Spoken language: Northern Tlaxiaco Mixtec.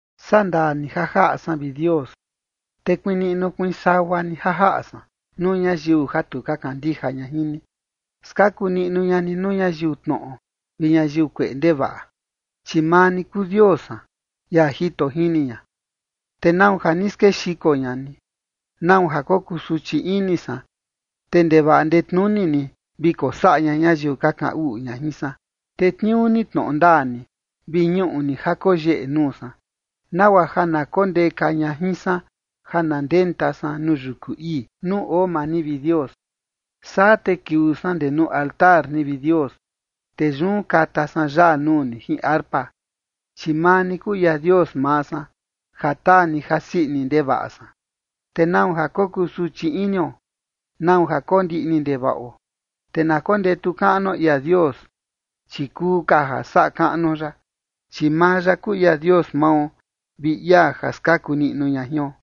Sandaa ni ja jaꞌa san, vi Dios, te kuiin niꞌnu kuiin sagua ni ja jaꞌa san nuu ñayiu ja tu ka kandija ña jin ni. Skaku niꞌnu ña ni nuu ñayiu tnoꞌo vi ñayiu kueꞌe ndevaꞌa. Chi maa ni kuu Dios san, ia jito jini ña. ¿Te nau ja ni skexiko ña ni? ¿Nau ja kokusuchi ini san, te ndevaꞌa ndetnuni ni vi kosaꞌa ña ñayiu ka kaꞌan uꞌu ña jin san? Tetniuu ni tnoꞌo ndaa ni, vi ñuꞌu ni ja koyeꞌe nuu san, nagua ja na kondeka ña jin san ja na ndenta san nuu yuku ii, nuu oo maa ni, vi Dios. Saa te kiuu san ndee nuu altar ni, vi Dios, te yun kata san yaa nuu ni jin arpa. Chi maa ni kuu ia Dios maa san, ja taa ni jasii ini ndevaꞌa san. ¿Te nau ja kokusuchi inio? ¿Nau ja kondiꞌni ndevaꞌo? Te na kondetu kaꞌnuo ia Dios, chi kuu ka ja saꞌa kaꞌnuo ya, chi maa ya kuu ia Dios mao, vi ia ja skaku niꞌnu ña jion.